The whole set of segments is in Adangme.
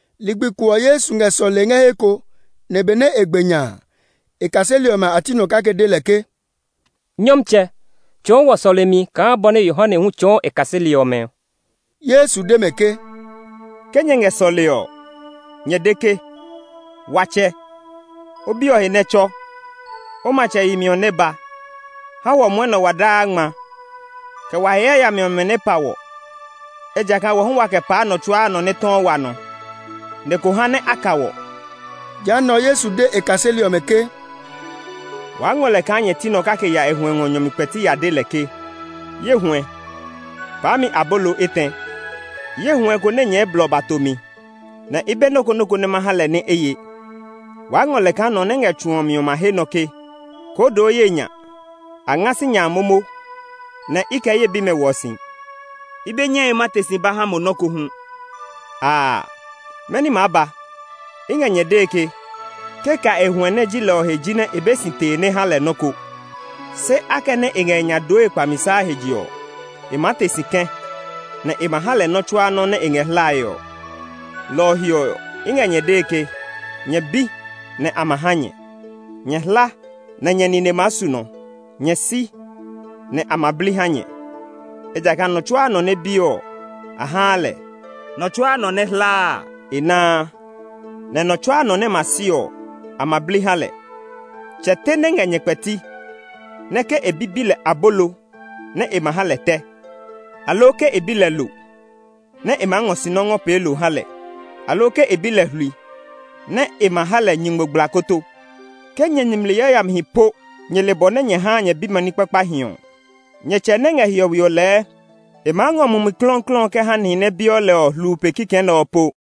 Ligbi ko ɔ, Yesu ngɛ sɔlee ngɛ he ko, nɛ benɛ e gbe nya a, e kaseli ɔmɛ a ti nɔ kake de lɛ ke, “Nyɔmtsɛ, tsɔɔ wɔ sɔlemi kaa bɔ nɛ Yohane hu tsɔɔ e kaseli ɔmɛ ɔ.” Yesu de mɛ ke, “Ke nyɛ ngɛ sɔlee ɔ, nyɛ de ke, ‘Wa Tsɛ, O biɛ ɔ he nɛ tsɔ; O matsɛ yemi ɔ nɛ ba. Ha wɔ mwɔnɛ ɔ wa daa nya ngma. Kɛ wa he yayami ɔmɛ nɛ pa wɔ; ejakaa wɔ hu waa kɛ paa nɔ tsuaa nɔ nɛ tɔɔ wa nɔ. Nɛ ko ha nɛ a ka wɔ.’” Jehanɛ ɔ, Yesu de e kaseli ɔmɛ ke, “Waa ngɔ lɛ kaa nyɛ ti nɔ kake ya e huɛ ngɔ nyɔ mi kpɛti ya de lɛ ke, ‘Ye huɛ, paa mi abolo etɛ. Ye huɛ ko nɛ nyɛɛ blɔ ba to mi, nɛ i be nɔ́ ko nɔ́ ko nɛ ma ha lɛ nɛ e ye!’ Waa ngɔ lɛ kaa nɔ nɛ ngɛ tsu ɔ mi ɔ ma he nɔ ke, ‘Koo doo ye nya! A nga sinya a momo, nɛ i kɛ ye bimɛ hwɔ si; i be nyɛe ma te si ba ha mo nɔ́ ko hu.’ Aa, mɛni maa ba? I ngɛ nyɛ dee ke, ke ka e huɛ nɛ ji lɛ ɔ he jinɛ e be si tee nɛ e ha lɛ nɔ́ ko; se akɛnɛ e ngɛ e nya dooe kpamisa he je ɔ, e maa te si kɛ̃, nɛ e ma ha lɛ nɔ́ tsuaa nɔ́ nɛ e ngɛ hlae ɔ. “Lɔ ɔ he ɔ, i ngɛ nyɛ dee ke, nyɛ bi, nɛ a ma ha nyɛ; nyɛ hla, nɛ nyɛ nine maa su nɔ; nyɛ si agbo ɔ, nɛ a ma bli ha nyɛ. Ejakaa nɔ tsuaa nɔ nɛ biɔ ɔ, a haa lɛ; nɔ tsuaa nɔ nɛ hlaa a, e naa, nɛ nɔ tsuaa nɔ nɛ ma si sinya a, a ma bli ha lɛ. Tsɛ te nɛ ngɛ nyɛ kpɛti, nɛ ke e bi bi lɛ abolo nɛ e ma ha lɛ tɛ? Aloo ke e bi lɛ lo, nɛ e maa ngɔ sinɔ ngɔ pee lo ngɔ ha lɛ? Aloo ke e bi lɛ hlui, nɛ e ma ha lɛ nyingmogblakoto? Ke nyɛ nimli yayamihi po nyɛ le bɔ nɛ nyɛ haa nyɛ bimɛ ní kpakpahi ɔ, nyɛ Tsɛ nɛ ngɛ hiɔwe ɔ lɛɛ e maa ngɔ Mumi Klɔuklɔu ɔ kɛ ha nihi nɛ biɔ lɛ ɔ kulaa pe kikɛ nɛ ɔ po!”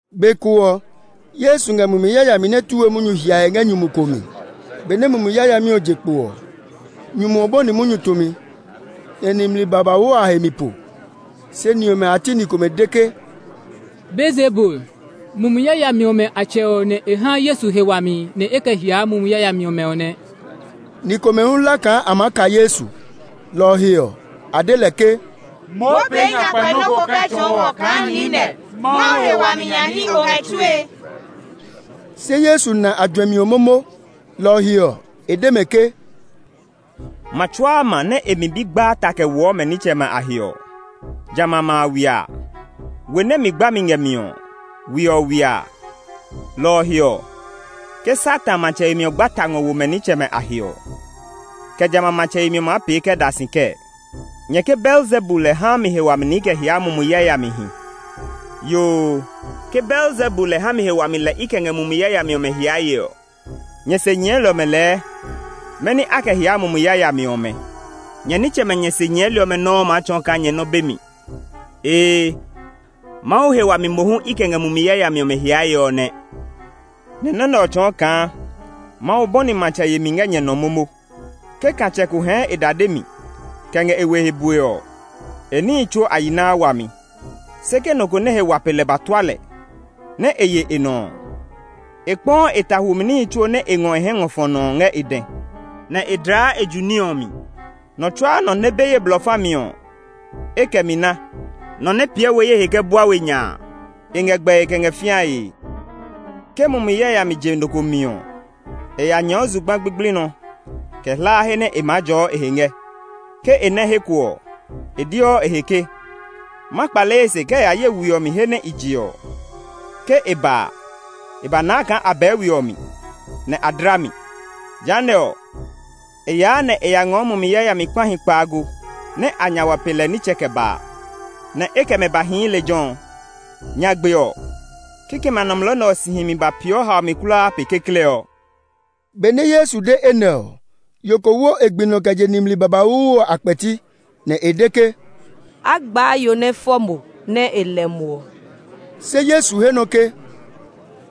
Be ko ɔ, Yesu ngɛ mumi yayami nɛ tu we munyu hiae ngɛ nyumu ko mi. Benɛ mumi yayami ɔ je kpo ɔ, nyumu ɔ bɔni munyu tumi, nɛ nimli babauu ɔ a he mi po. Se ni ɔmɛ a ti ni komɛ de ke, “Beelzebul, mumi yayami ɔmɛ a tsɛ ɔ nɛ e haa Yesu he wami nɛ e kɛ hiaa mumi yayami ɔmɛ ɔ nɛ.” Ni komɛ hu hla kaa a maa ka Yesu. Lɔ ɔ he ɔ, a de lɛ ke, “Moo pee nyakpɛ nɔ́ ko kɛ tsɔɔ wɔ kaa niinɛ, Mawu he wami nya ní o ngɛ tsue.” Se Yesu na a juɛmi ɔ momo, lɔ ɔ he ɔ, e de mɛ ke, “Ma tsuaa ma nɛ e mi bi gbaa ta kɛ woɔ mɛ nitsɛmɛ a he ɔ, jamɛ a ma a ywiaa; we nɛ mi gbami ngɛ mi ɔ, we ɔ ywiaa. Lɔ ɔ he ɔ, ke Satan matsɛ yemi ɔ gba ta ngɔ wo mɛ nitsɛmɛ a he ɔ, kɛ jamɛ a matsɛ yemi ɔ maa pee kɛ da si kɛɛ? Nyɛ ke Beelzebul lɛ haa mi he wami nɛ i kɛ hiaa mumi yayamihi. Yoo, ke Beelzebul lɛ ha mi he wami lɛ i kɛ ngɛ mumi yayami ɔmɛ hiae ɔ, nyɛ se nyɛɛli ɔmɛ lɛɛ mɛni a kɛ hiaa mumi yayami ɔmɛ? Nyɛ nitsɛmɛ nyɛ se nyɛɛli ɔmɛ nɔuu maa tsɔɔ kaa nyɛ nɔ́ be mi. Ee, Mawu he wami mohu i kɛ ngɛ mumi yayami ɔmɛ hiae ɔ nɛ; nɛ nɔ́ nɛ ɔ tsɔɔ kaa Mawu bɔni matsɛ yemi ngɛ nyɛ nɔ momo. “Ke katsɛ ko hɛɛ e dade mi kɛ ngɛ e we he bue ɔ, e níhi tsuo a yi naa wami. Se ke nɔ nɛ he wa pe lɛ ba tua lɛ, nɛ e ye e nɔ ɔ, e kpɔɔ e ta hwumi níhi tsuo nɛ e ngɔ e hɛ ngɔ fɔ nɔ ɔ ngɛ e dɛ, nɛ e dlaa e ju ní ɔ mi. “Nɔ tsuaa nɔ nɛ be ye blɔ fa mi ɔ, e kɛ mi na; nɔ nɛ piɛ we ye he kɛ bua we nya a, e ngɛ gbɛe kɛ ngɛ fĩae. “Ke mumi yayami je nɔ ko mi ɔ, e ya nyɛɛɔ zugba gbigbli nɔ kɛ hlaa he nɛ e maa jɔɔ e he ngɛ. Ke e nɛ he ko ɔ, e deɔ e he ke, ‘Ma kpale ye se kɛ ya ye we ɔ mi he nɛ i je ɔ.’ Ke e ba a, e ba naa kaa a bɛɛ we ɔ mi, nɛ a dla mi. Jehanɛ ɔ, e yaa nɛ e ya ngɔɔ mumi yayami kpahi kpaago nɛ a nya wa pe lɛ nitsɛ kɛ baa, nɛ e kɛ mɛ ba hii lejɛ ɔ. Nyagbe ɔ, kikɛmɛ a nɔmlɔ nɛ ɔ si himi ba peeɔ haomi kulaa pe kekle ɔ.” Benɛ Yesu de enɛ ɔ, yo ko wo e gbi nɔ kɛ je nimli babauu ɔ a kpɛti, nɛ e de ke, “A gbaa yo nɛ fɔ mo, nɛ e lɛ mo ɔ!” Se Yesu he nɔ ke,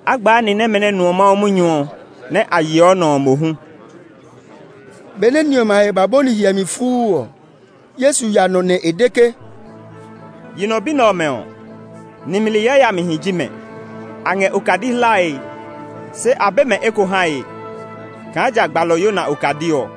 “A gbaa ni nɛmɛ nɛ nuɔ Mawu munyu ɔ, nɛ a yeɔ nɔ ɔ mohu!” Benɛ ni ɔmɛ a he ba bɔni hiɛmi fuu ɔ, Yesu ya nɔ nɛ e de ke. “Yi nɔ bi nɛ ɔmɛ ɔ, nimli yayamihi ji mɛ! A ngɛ okadi hlae, se a be mɛ eko hae, kaa ja gbalɔ Yona okadi ɔ.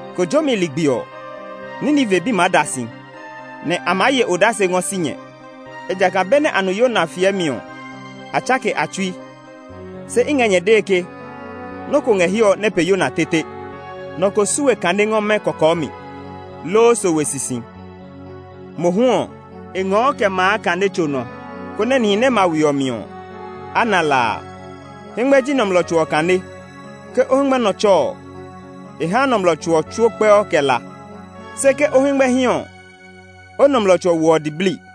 Kojomi ligbi ɔ, Nineve bi maa da si, nɛ a maa ye odase ngɔ si nyɛ. Ejakaa benɛ a nu Yona fiɛmi ɔ, a tsake a tsui. Se i ngɛ nyɛ dee ke, nɔ́ ko ngɛ hiɛ ɔ nɛ pe Yona tete! “Nɔ ko su we kane ngɔ mɛ́ kɔkɔɔ mi, loo sowe sisi. Mohu ɔ, e ngɔɔ kɛ maa kane tso nɔ, konɛ ke nihi ma we ɔ mi ɔ, a na la a. Hɛngmɛ ji nɔmlɔ tso ɔ kane. Ke o hɛngmɛ nɔ tsɔ ɔ, e haa nɔmlɔ tso ɔ tsuo kpɛɔ kɛ la; se ke o hɛngmɛ hí ɔ, o nɔmlɔ tso ɔ woɔ diblii.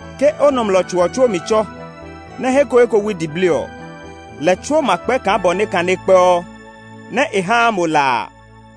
Ke o nɔmlɔ tso ɔ tsuo mi tsɔ, nɛ he ko he ko wui diblii ɔ, lɛ tsuo ma kpɛ kaa bɔ nɛ kane kpɛɔ nɛ e haa mo la a.”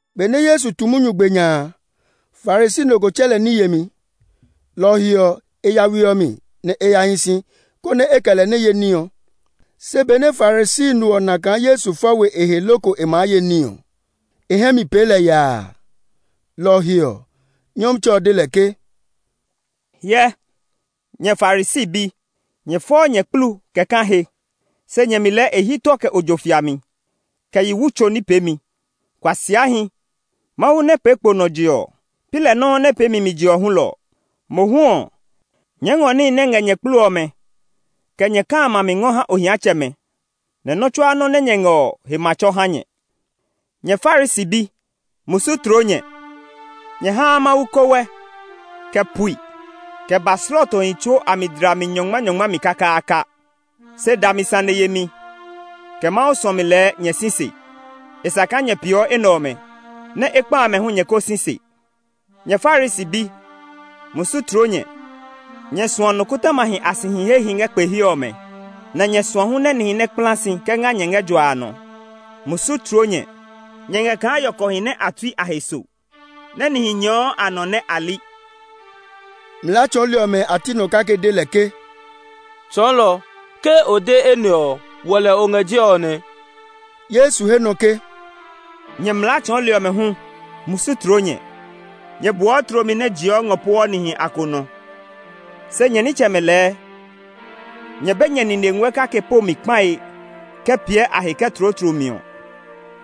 Benɛ Yesu tu munyu gbe nya a, Farisi no ko tsɛ lɛ ní yemi. Lɔ ɔ he ɔ, e ya we ɔ mi, nɛ e ya hi si, konɛ e kɛ lɛ nɛ ye ní ɔ. Se benɛ Farisi no ɔ na kaa Yesu fɔ we e he loko e maa ye ní ɔ, e hɛ mi pee lɛ yaa. Lɔ ɔ he ɔ, Nyɔmtsɛ ɔ de lɛ ke, “Hyɛ, nyɛ Farisi bi, nyɛ fɔɔ nyɛ kplu kɛ kã he, se nyɛ mi lɛɛ e hyi tɔ kɛ ojo fiami, kɛ yi wu tso ní peemi. Kuasiahi! Mawu nɛ pee kpo nɔ je ɔ, pi lɛ nɔuu nɛ pee mi mi je ɔ hulɔ ɔ? Mohu ɔ, nyɛɛ ngɔ níhi nɛ ngɛ nyɛ kplu ɔmɛ, kɛ nyɛ kã amɛ a mi ngɔ ha ohiatsɛmɛ, nɛ nɔ́ tsuaa nɔ́ nɛ nyɛ ngɛ ɔ he ma tsɔ ha nyɛ. “Nyɛ Farisi bi, musu tloo nyɛ! Nyɛ haa Mawu kowɛ, kɛ pui, kɛ ba slɔɔtohi tsuo mi dlami nyɔngmanyɔngma mi kakaaka, se dami sane yemi, kɛ Mawu suɔmi lɛɛ nyɛ si se. E sa kaa nyɛ peeɔ enɛ ɔmɛ, nɛ ekpa amɛ hu nyɛ ko si se. “Nyɛ Farisi bi, musu tloo nyɛ! Nyɛ suɔ nikɔtɔmahi a sihi hehi ngɛ kpe he ɔmɛ, nɛ nyɛ suɔ hu nɛ nihi nɛ kpla si kɛ nga nyɛ ngɛ jua nɔ. Musu tloo nyɛ! Nyɛ ngɛ kaa yɔkɔhi nɛ a tui a he so, nɛ nihi nyɛɛɔ a nɔ nɛ a li.” Mlaa tsɔɔli ɔmɛ a ti nɔ kake de lɛ ke, “Tsɔɔlɔ, ke o de enɛ ɔ, wɔ lɛ o ngɛ jɛe ɔ nɛ!” Yesu he nɔ ke, “Nyɛ mlaa tsɔɔli ɔmɛ hu, musu tloo nyɛ! Nyɛ boɔ tlomi nɛ jiɔ ngɔ pueɔ nihi a konɔ. Se nyɛ nitsɛmɛ lɛɛ, nyɛ be nyɛ nine nguɛ kake po mi kpae kɛ piɛ a he kɛ tloo tlomi ɔ.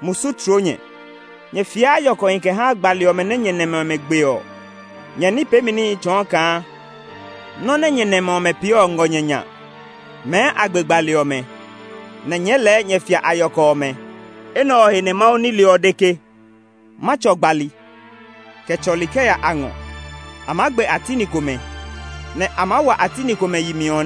Musu tloo nyɛ! Nyɛ fiaa yɔkɔhi kɛ haa gbali ɔmɛ nɛ nyɛ nɛmɛ ɔmɛ gbe ɔ. Nyɛ ní peemi níhi tsɔɔ kaa nɔ́ nɛ nyɛ nɛmɛ ɔmɛ pee ɔ ngɔ nyɛ nya; mɛɛ a gbe gbali ɔmɛ, nɛ nyɛɛ lɛɛ nyɛ fia a yɔkɔ ɔmɛ. Enɛ ɔ he nɛ Mawu nile ɔ de ke, ‘Ma tsɔ gbali, kɛ tsɔli kɛ ya a ngɔ; a maa gbe a ti ni komɛ, nɛ a maa wa a ti ni komɛ yi mi.’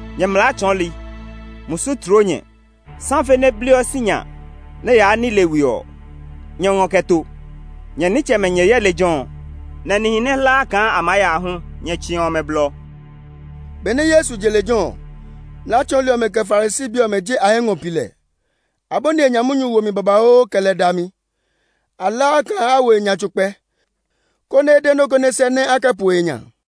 “Nyɛ mlaa tsɔɔli, musu tloo nyɛ! Safe nɛ bliɔ sinya nɛ yaa nile we ɔ, nyɛ ngɔ kɛ to; nyɛ nitsɛmɛ nyɛ yɛ lejɛ ɔ, nɛ nihi nɛ hlaa kaa a maa ya hu nyɛ tsiɔ mɛ blɔ!” Benɛ Yesu je lejɛ ɔ, mlaa tsɔɔli ɔmɛ, kɛ Farisi bi ɔmɛ je a hɛ ngɔ pi lɛ. A bɔni e nya munyu womi babauu, kɛ lɛ dami. A hlaa kaa a wo e nya tso kpɛ, konɛ e de nɔ́ ko nɛ sɛ́, nɛ a kɛ po e nya.